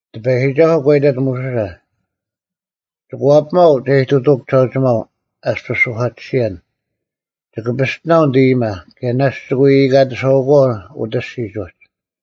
ᑎᐸᔨᒋᒐᓱᐤ ᒂ ᐃᑕᑦ ᒧᓱᓴ, “ᒋᑭ ᐛᐱᒪᐤ ᒐ ᐃᑐᑐᐅᒃ ᒋᓴᐅᒋᒪᐤ ᐊᔅᐱᔅ ᓱᐧᑲᑎᓯᔭᓐ᙮ ᒋᑭ ᐱᔅᑎᓇᐤ ᓂᑦ ᐃᔨᒪ, ᑭᔭ ᓇᔅᒡ ᒋᑭ ᐎ ᐃᑲᑎᓴᐛᐤ ᐅᑦ ᐊᔅᒋᒡ ᐅᒡ᙮”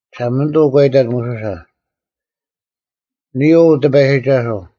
ᒋᓴᒪᓂᑐᐤ ᒂ ᐃᑕᑦ ᒧᓱᓴ, “ᓂᔾ ᐅ ᑎᐸᔨᒋᒐᓱᐤ᙮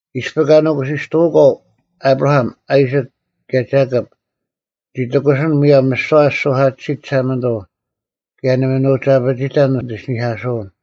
ᐃᔅᐱ ᑲ ᓄᑯᓯᔅᑐᐅᒂᐤ ᐊᑉᕋᐊᒻ, ᐊᐃᓯᒃ, ᑭᔭ ᒐᑭᑉ ᓂᒋ ᑎᑯᓯᓐ ᒧᔭᒻ ᒥᓯᐛ ᐊᓯ ᓱᐧᑲᑎᓯᑦ ᒋᓴᒪᓂᑐᐤ ᑭᔭ ᓇᒪ ᓂ ᐅᒋ ᐊᐱᒋᑕᓐ ᓂᑦ ᐃᓯᓂᐧᑲᓱᐅᓐ᙮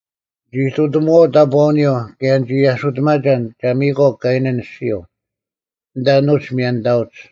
ᓂᒋ ᐃᑐᑎᒧᐛᐅᒡ ᑕᑈᐅᓂᔪᐤ ᑭᔭ ᓂᒋ ᐊᓱᑎᒪᒐᓐ ᒐ ᒥᔨᒂᐤ ᑲᐃᓇᓐ ᐊᔅᒋᔪᐤ, ᐊᓐᑕ ᐊᓄᒡ ᒥᔭᓂᑕᐅᒡ᙮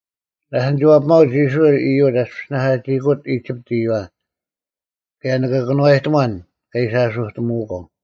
ᓴᔅ ᓂᒋ ᐛᐱᒪᐅᒡ ᐃᔅᕋᐃᓪ ᐃᔪᒡ ᐊᔅᐱᔅ ᓂᓇᐧᑲᒋᐃᑯᒡ ᐃᒋᑉᑦ ᐃᔪᐛ, ᑭᔭ ᓂᑭ ᑭᓄᐛᔨᑎᒺᓐ ᑲ ᐃᓯ ᐊᓱᑎᒧᐅᒂᐤ᙮”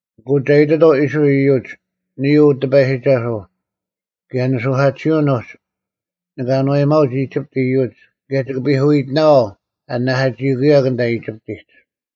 “ᐊᐅᑯᐤ ᒐ ᐃᑎᑥᐤ ᐃᔅᕋᐃᓪ ᐃᔪᒡ, ‘ᓂᔾ ᐅ ᑎᐸᔨᒋᒐᓱᐤ᙮ ᑭᔭ ᓂᓱᐧᑲᑎᓯᐅᓐ ᐅᒡ ᓂᑭ ᐊᓏᔨᒪᐅᒡ ᐃᒋᑉᑦ ᐃᔪᒡ ᑭᔭ ᒋᑭ ᐱᐧᑯᐃᑎᓇᐛᐤ ᐊ ᓂᓇᐧᑲᒋᐃᑯᐅᔭᒄ ᐊᓐᑕ ᐃᒋᑉᑎᒡ᙮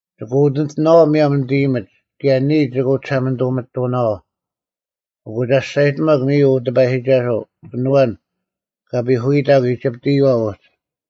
ᒋᑭ ᐅᑎᓂᑎᓇᐛᐤ ᒧᔭᒻ ᓂᑦ ᐃᔨᒥᒡ ᑭᔭ ᓂᔾ ᒋᑭ ᐅᒋᓴᒪᓂᑐᒥᑐᓇᐛᐤ, ᐊᑯ ᒐ ᒋᔅᒐᔨᑎᒪᒄ ᓂᔾ ᐅ ᑎᐸᔨᒋᒐᓱᐤ, ᐊᓐ ᐊᐛᓐ ᑲ ᐱᐧᑯᐎᑕᒄ ᐃᒋᑉᑦ ᐃᔪᐛ ᐅᒡ᙮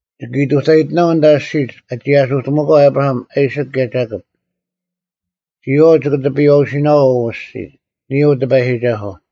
ᒋᑭ ᐃᑐᑕᔨᑎᓇᐛᐤ ᐊᓐᑕ ᐊᔅᒋᒡ ᑲ ᒋᒋ ᐊᓱᑎᒧᐅᒂᐤ ᐊᑉᕋᐊᒻ, ᐊᐃᓯᒃ, ᑭᔭ ᒐᑭᑉ᙮ ᒋᔨᐛᐤ ᒋᑭ ᑎᐱᔨᐛᐅᓯᓇᐛᐤ ᐅ ᐊᔅᒋᔾ, ᓂᔾ ᐅ ᑎᐸᔨᒋᒐᓱᐤ᙮’”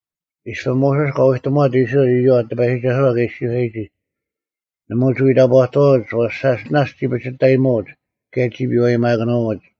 ᐃᔅᐱ ᒧᓱᔅ ᑲ ᐎᑎᒧᐛᑦ ᐃᔅᕋᐃᓪ ᐃᔪᐛ ᑎᐸᔨᒋᒐᓱᐛ ᑲ ᐃᔅᒋᔄᔨᒋ, ᓇᒪ ᐅᒋ ᐎ ᑕᑈᑐᐛᐅᒡ ᐛᔅ ᓴᔅ ᓇᔅᒡ ᒋ ᐱᒋᑕᐃᒧᐅᒡ ᑭᔭ ᒋ ᐱᐛᔨᒪᑭᓄᐎᒡ᙮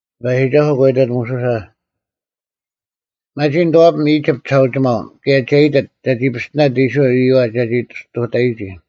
ᑎᐸᔨᒋᒐᓱᐤ ᒂ ᐃᑕᑦ ᒧᓱᓴ, “ᒪᒋ ᓂᑐᐛᐱᒻ ᐃᒋᑉᑦ ᒋᓴᐅᒋᒪᐤ ᑭᔭ ᒐ ᐃᑎᑦ ᒐᒋ ᐱᔅᑎᓇᑦ ᐃᔅᕋᐃᓪ ᐃᔪᐛ ᒐᒋ ᔅᑐᑕᔨᒋ᙮”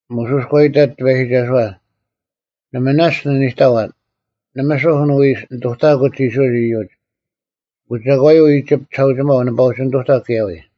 ᒧᓱᔅ ᒂ ᐃᑕᑦ ᑎᐸᔨᒋᒐᓱᐛ, “ᓇᒪ ᓇᔅᒡ ᓂ ᓂᑕᐛᓐ, ᓇᒪ ᓱᐧᒃ ᓂᐎ ᓂᑐᑕᑯᒡ ᐃᔅᕋᐃᓪ ᐃᔪᒡ, ᐊᑯ ᒐᒂᔪᐤ ᐃᒋᑉᑦ ᒋᓴᐅᒋᒪᐤ ᓂᐸ ᐅᒋ ᓂᑐᑕᒄ ᑭᔭ ᐎᔾ?”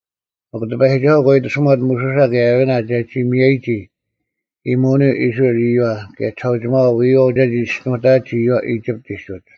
ᒥᒄ ᑎᐸᔨᒋᒐᓱᐤ ᒂ ᐃᑎᓱᒪᑦ ᒧᓱᓴ ᑭᔭ ᐊᕋᓇ ᒐᒋ ᒥᔭᔨᒋ ᐃᔨᒧᐅᓂᔪᐤ ᐃᔅᕋᐃᓪ ᐃᔪᐛ ᑭᔭ ᒋᓴᐅᒋᒪᐛ ᐎᔨᐛᐤ ᒐᒋ ᒋᔅᒋᓄᑕᐊᒡ ᐃᔪᐛ ᐃᒋᑉᑎᒡ ᐅᒡ᙮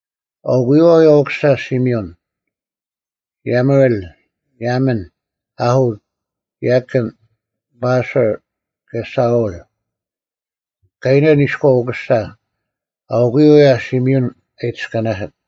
ᐊᐅᑯᔪᐛ ᐅᔭ ᐅᑯᓴ ᓯᒥᐅᓐ: ᔭᒧᐃᓪ, ᔭᒥᓐ, ᐅᐦᐊᑦ, ᔭᑭᓐ, ᓱᐊᕐ, ᑭᔭ ᓴᐅᓪ, ᑲᐃᓇᓐ ᐃᔎᐤ ᐅᑯᓴ; ᐊᐅᑯᔪᐤ ᐅᔭ ᓯᒥᐅᓐ ᐊ ᐃᑎᔅᑲᓇᓯᑦ᙮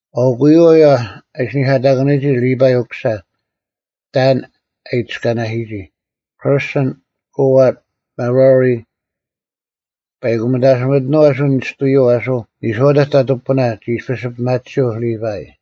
ᐊᐅᑯᔪᐛ ᐅᔭ ᐊᓯᓂᐧᑲᑕᑭᓄᔨᒋ ᓕᐸᐃ ᐅᑯᓴ ᑕᓐ ᐊᑎ ᐃᑎᔅᑲᓇᓯᔨᒋ; ᑭᕐᓱᓐ, ᑯᐊᑦ, ᒪᕋᕆ᙮ ᐸᐃᑯ ᒥᑕᓯᒥᑎᓄᐤ ᐊᓱ ᓂᔅᑐᔪᐤ ᐊᓱ ᓂᔄᐅᑕᒡ ᑕᑐᐤ ᐱᐳᓇ ᒋ ᐃᔅᐱᔅ ᐱᒪᑎᓯᔪᐤ ᓕᐸᐃ᙮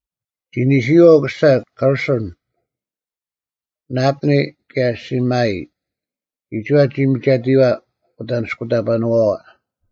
ᒋ ᓂᓯᔨᐛ ᐅᑯᓴ ᑭᕐᓱᓐ: ᓕᑉᓂ ᑭᔭ ᓯᒥᔨᒋ, ᒋᒋᐛ ᒋ ᒥᒐᑎᔨᐛ ᐅᑦ ᐊᓂᔅᑯᑕᐸᓄᐛᐛ᙮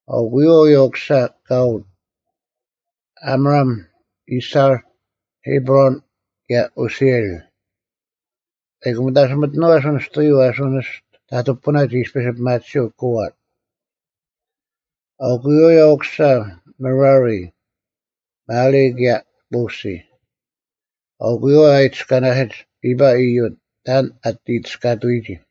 ᐊᐅᑯᔪᐛ ᐅᔭ ᐅᑯᓴ ᑯᐊᑦ: ᐊᒻᕋᒻ, ᐃᔅᐊᕐ, ᐃᑉᕈᓐ, ᑭᔭ ᐅᓯᐃᓪ, ᐸᐃᑯ ᒥᑕᓯᒥᑐᓄᐤ ᐊᓱ ᓂᔅᑐᔪᐤ ᐊᓱ ᓂᔅᑐ ᑕᑐᐤ ᐱᐳᓇ ᒋ ᐃᔅᐱᔅ ᐱᒪᑎᓯᔪᐤ ᑯᐊᑦ᙮ ᐊᐅᑯᔪᐛ ᐅᔭ ᐅᑯᓴ ᒪᕋᕆ: ᒪᓕ ᑭᔭ ᒧᓯ᙮ ᐊᐅᑯᔪᐛ ᐅᔭ ᐊ ᐃᑎᔅᑲᓇᓯᒡ ᓕᐸᐃ ᐃᔪᒡ ᑕᓐ ᐊᑎ ᐃᑎᔅᑲᑐᐎᒋ᙮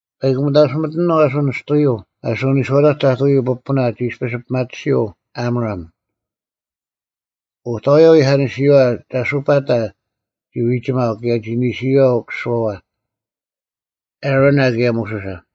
ᐸᐃᑯ ᒥᑕᓯᒥᑎᓄᐤ ᐊᓱ ᓂᔅᑐᔪᐤ ᐊᓱ ᓂᔄᐅᑕᒡ ᑕᑐᐤ ᐱᐳᓇ ᒋ ᐃᔅᐱᔅ ᐱᒪᑎᓯᔪᐤ ᐊᒻᕋᒻ, ᐅᑕᐎᔭ ᐎᐧᑲᓂᓯᔨᐛ ᒐᑲᐸᑕ ᒋ ᐎᒋᒪᐤ ᑭᔭ ᒋ ᓂᓯᔨᐛ ᐅᑯᓱᐛᐛ, ᐊᕋᓇ ᑭᔭ ᒧᓱᓴ᙮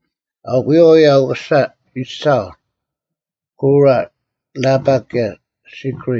ᐊᐅᑯᔪᐛ ᐅᔭ ᐅᑯᓴ ᐃᔅᐊᕐ: ᑯᕋ, ᓇᐸᒃ, ᑭᔭ ᓯᒃᕆ᙮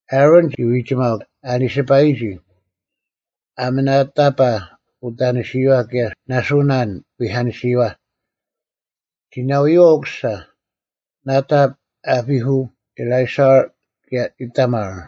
ᐊᕋᓐ ᒋ ᐎᒋᒪᐤ ᐊᓕᓯᐸᔨᒋ, ᐊᒥᓇᑕᐸ ᐅᑕᓂᓯᔨᐛ ᑭᔭ ᓇᓱᓇ ᐎᐧᑲᓂᓯᔨᐛ; ᒋ ᓇᐎᔪᐛ ᐅᑯᓴᐛᐛ, ᓇᑕᑉ, ᐊᐱᐦᐅ, ᐃᓕᐊᓴᕐ, ᑭᔭ ᐃᑕᒪᕐ᙮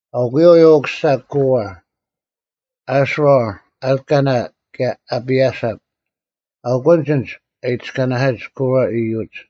ᐊᐅᑯᔪᐛ ᐅᔭ ᐅᑯᓴ ᑯᕋ: ᐊᔅᓯᕐ, ᐊᓪᑲᓇ, ᑭᔭ ᐊᐱᐊᓴᑉ, ᐊᐅᑯᓐᒡ ᐊᓐᒡ ᐊ ᐃᑎᔅᑲᓇᓯᒡ ᑯᕋ ᐃᔪᒡ᙮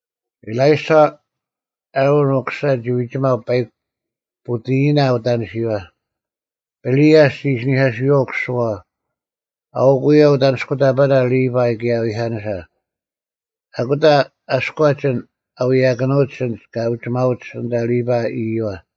ᐃᓕᐊᓴᕐ, ᐊᕋᓐ ᐅᑯᓴ ᒋ ᐎᒋᒪᐤ ᐸᐃᒄ ᐳᑎᐃᓚ ᐅᑕᓂᓯᔪᐛ; ᐱᓂᐦᐊᔅ ᒋ ᐃᓯᓂᐧᑲᓱᔪᐛ ᐅᑯᓱᐛᐛ᙮ ᐊᐅᒄ ᐅᔭ ᐅᑦ ᐊᓂᔅᑯᑕᐸᓇ ᓕᐸᐃ ᑭᔭ ᐎᐧᑲᓂᓴ᙮ ᐊᑯᑕ ᐊᔎᒡ ᐊᓐ ᐊ ᐎᔭᑭᓄᐅᒡ ᐊᓐᒡ ᑲ ᐅᒋᒪᐅᒡ ᐊᓐᑕ ᓕᐸᐃ ᐃᔪᐛ᙮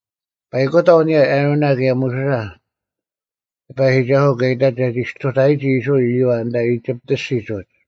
ᐸᐃᑯᑕᐤ ᐊᓂᔭ ᐊᕋᓇ ᑭᔭ ᒧᓱᓴ ᑎᐸᔨᒋᒐᓱᐤ ᑲ ᐃᑕᑦ ᒐᒋ ᔅᑐᑕᐊᔨᒋ ᐃᔅᕋᐃᓪ ᐃᔪᐛ ᐊᓐᑕ ᐃᒋᑉᑦ ᐊᔅᒋᒡ ᐅᒡ᙮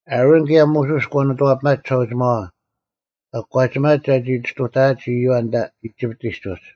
ᐊᕋᓐ ᑭᔭ ᒧᓱᔅ ᒂ ᓂᑐᐛᐱᒪᒡ ᒋᓴᐅᒋᒪᐛ ᒂ ᑯᒂᒋᒪᒡ ᒐᒋ ᔅᑐᑕᐊᒡ ᐃᔪᐛ ᐊᓐᑕ ᐃᒋᑉᑎᒡ ᐅᒡ᙮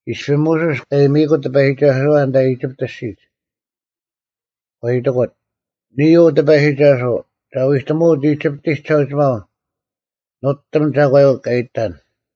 ᐃᔅᐱ ᒧᓱᔅ ᑲ ᐃᔨᒥᐃᑯᑦ ᑎᐸᔨᒋᒐᓱᐛ ᐊᓐᑕ ᐃᒋᑉᑦ ᐊᔅᒋᒡ᙮ ᒂ ᐃᑎᑯᑦ, “ᓂᔾ ᐅ ᑎᐸᔨᒋᒐᓱᐤ᙮ ᒐ ᐎᑎᒧᐅᑦ ᐃᒋᑉᑎᒡ ᒋᓴᐅᒋᒪᐤ ᓄᑎᒻ ᒐᒂᔪᐤ ᑲ ᐃᑎᑕᓐ᙮”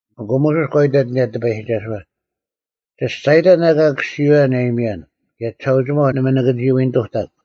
ᐊᑯ ᒧᓱᔅ ᒂ ᐃᑕᑦ ᐊᓂᔭ ᑎᐸᔨᒋᒐᓱᐛ, “ᒋ ᒋᔅᒐᔨᑕᓐ ᐊᑲ ᑭᔅᒋᐅᔭᓐ ᐊ ᐃᔨᒥᔭᓐ, ᑭᔭ ᒋᓴᐅᒋᒪᐤ ᓇᒪ ᓂᑭ ᒋ ᐎ ᓂᑐᑕᒃ᙮”